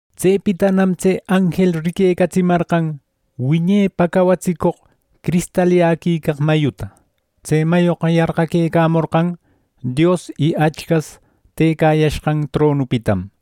Tsepitanam tse anjel riquecatsimarqan wiñepa cawatsicoq cristalyäquicaq mayuta. Tse mayoqa yarqaquecamorqan Dios y Achcas tëcayashqan tronupitam.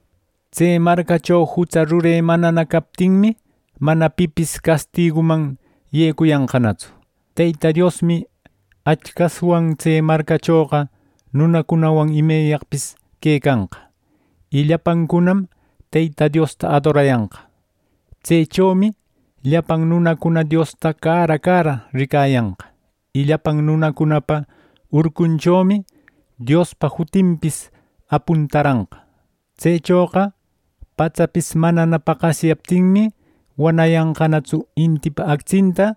Tse marcacho jutsa rure manana captinmi, mana pipis castiguman yecuyanqanatsu. Teyta Diosmi Achcaswan tse marcachoqa nunancunawan imeyaqpis quecanqa. Y llapancunam Teyta Diosta adorayanqa. Tsechomi llapan nunacuna Diosta cara cara ricayanqa y llapan nunacunapa urcunchomi Diospa jutinpis apuntaranqa. Tsechoqa patsapis manana paqasyaptinmi, wanayanqanatsu intipa actsinta,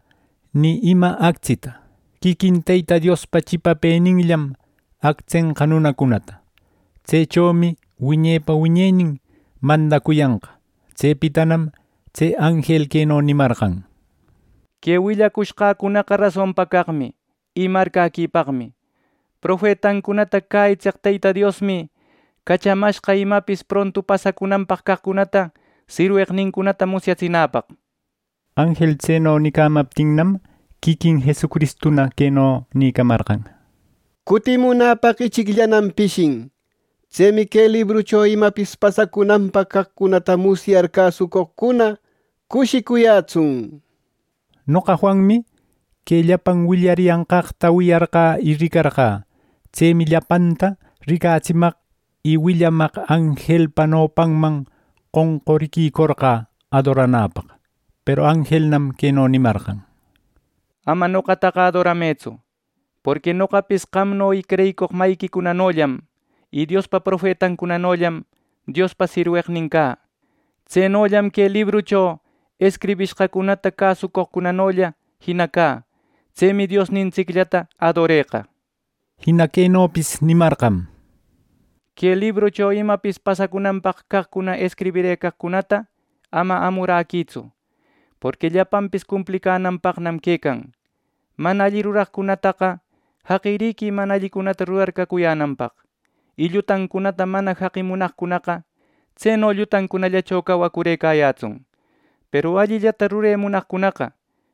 ni ima actsita. Quiquin Teyta Diospa chipapëninllam actsenqa nunacunata. Tsechomi wiñepa wiñenin mandacuyanqa. Tsepitanam tse anjel queno nimarqan: “Que willacushqäcunaqa rasonpa caqmi y marcäquipaqmi. Profetancunata cäyitseq Teyta Diosmi cachamashqa imapis prontu pasacunanpaq caqcunata sirweqnincunata musyatsinäpaq” nir. Anjel Tseno nicamaptinnam, quiquin Jesucristuna queno nïcamarqan: “¡Cutimunäpaq ichicllanam pishin! ¡Tsemi que librucho imapis pasacunanpaq caqcunata musyar cäsucoqcuna cushicuyätsun!” nir. Noqa Juanmi que llapan willariyanqaqta wiyarqä y ricarqä. Tsemi llapanta ricatsimaq y willamaq anjelpa nopanman qonquriquicorqä adoranäpaq. Peru anjelnam queno nimarqan: “Ama noqataqa adoramëtsu, Porqui noqapis qamno y creyicoq mayiquicunanollam y Diospa profetancunanollam Diospa sirweqninmi cä. Tsenollam que librucho escribishqacunata cäsucoqcunanolla jina cä. Tsemi Diosnintsicllata adoreqa” nishpa. Jina quenopis nimarqam: “Que librucho imapis pasacunanpaq caqcuna escribirëcaqcunata ama amuräquïtsu; porqui llapanpis cumplicänanpaqnam quecan. Mana alli ruraqcunataqa jaqiriquï mana allicunata rurar cacuyänanpaq; y llutancunata mana jaqi munaqcunaqa; tseno llutancunallacho cawacurëcayätsun. Peru allillata rure munaqcunaqa;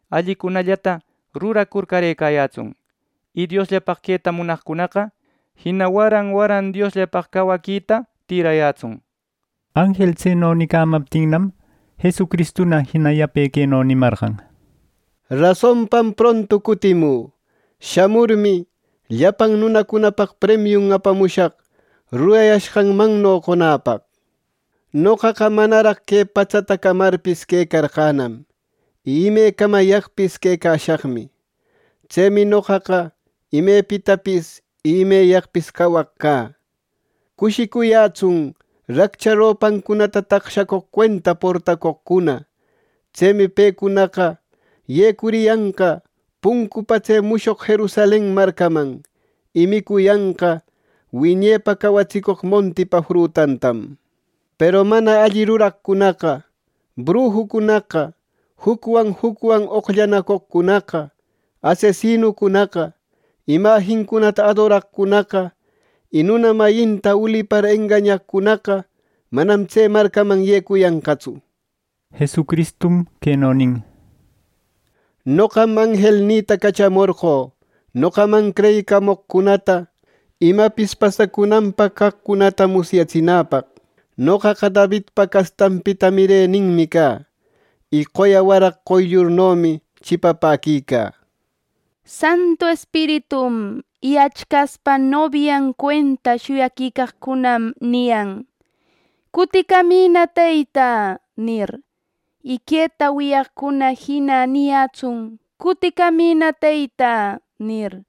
allicunallata ruracur carëcayätsun, y Diosllapaq queta munaqcunaqa jina waran waran Diosllapaq cawaquita tïrayätsun” nir. Anjel tseno nicamaptinnam, Jesucristuna jina yape queno nimarqan: “¡Rasonpam prontu cutimü! Shamurmi, llapan nunacunapaq premiun apamushaq rurayashqanmanno qonäpaq. Noqaqa manaraq que patsata camarpis quecarqänam, y ime camayaqpis quecashaqmi. Tsemi noqaqa imepitapis y imeyaqpis cawaq cä” nir. Cushicuyätsun raccha ropancunata taqshacoq cuenta portacoqcuna. Tsemi pecunaqa yecuriyanqa puncupa tse mushoq Jerusalen marcaman, y micuyanqa wiñepa cawatsicoq montipa frutantam. Peru mana alli ruraqcunaqa, brujucunaqa, jucwan jucwan oqllanacoqcunaqa, asesinucunaqa, imajincunata adoraqcunaqa y nuna mayinta ulipar engañaqcunaqa manam tse marcaman yecuyanqatsu. Jesucristum queno nin: “Noqam anjelnïta cachamorqö noqaman creyicamoqcunata imapis pasacunanpaq caqcunata musyatsinäpaq. Noqaqa Davidpa castanpita mireninmi cä. Y qoya waraq qoyllurnomi chipapäquicä” nir. Santu Espiritum y Achcaspa nobian cuenta shuyaquicaqcunam niyan: “Cuticamïna, Teyta” nir. Y queta wiyaqcuna jina niyätsun “Cuticamïna Teyta” nir.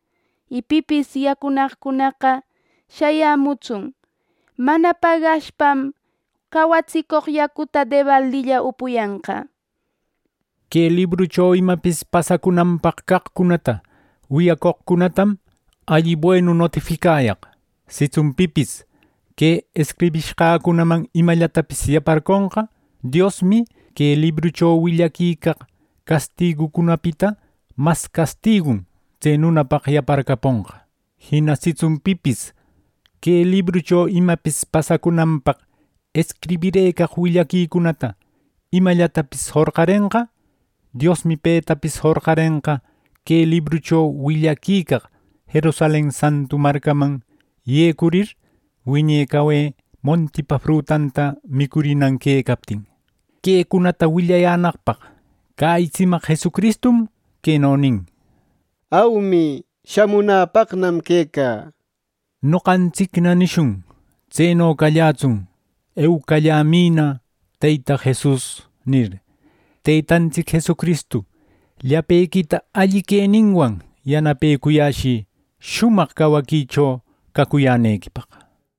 Y pipis yacunaqcunaqa shayämutsun, mana pagashpam cawatsicoq yacuta debaldilla upuyanqa. Que librucho imapis pasacunanpaq caqcunata wiyacoqcunatam alli buenu notificayaq: Sitsun pipis que escribishqacunaman imallatapis yaparconqa, Diosmi que librucho willaquicaq castigucunapita mas castigun tse nunapaq yaparcaponqa. Jina sitsun pipis que librucho imapis pasacunanpaq escribirëcaq willaquicunata imanllatapis jorqarenqa; Diosmi petapis jorqarenqa que librucho willaquicaq Jerusalen santu marcaman yecurir, wiñe cawe montipa frutanta micurinan quecaptin. Quecunata willayänaqpaq cäyitsimaq Jesucristum queno nin: “Aumi, shamunäpaqnam quecä” nir. Noqantsicna nishun “¡Tseno callätsun! ¡Eucallämïna, Teyta Jesus!” nir. Teytantsic Jesucristu llapequita alli queninwan yanapecuyäshï shumaq cawaquicho cacuyänequipaq.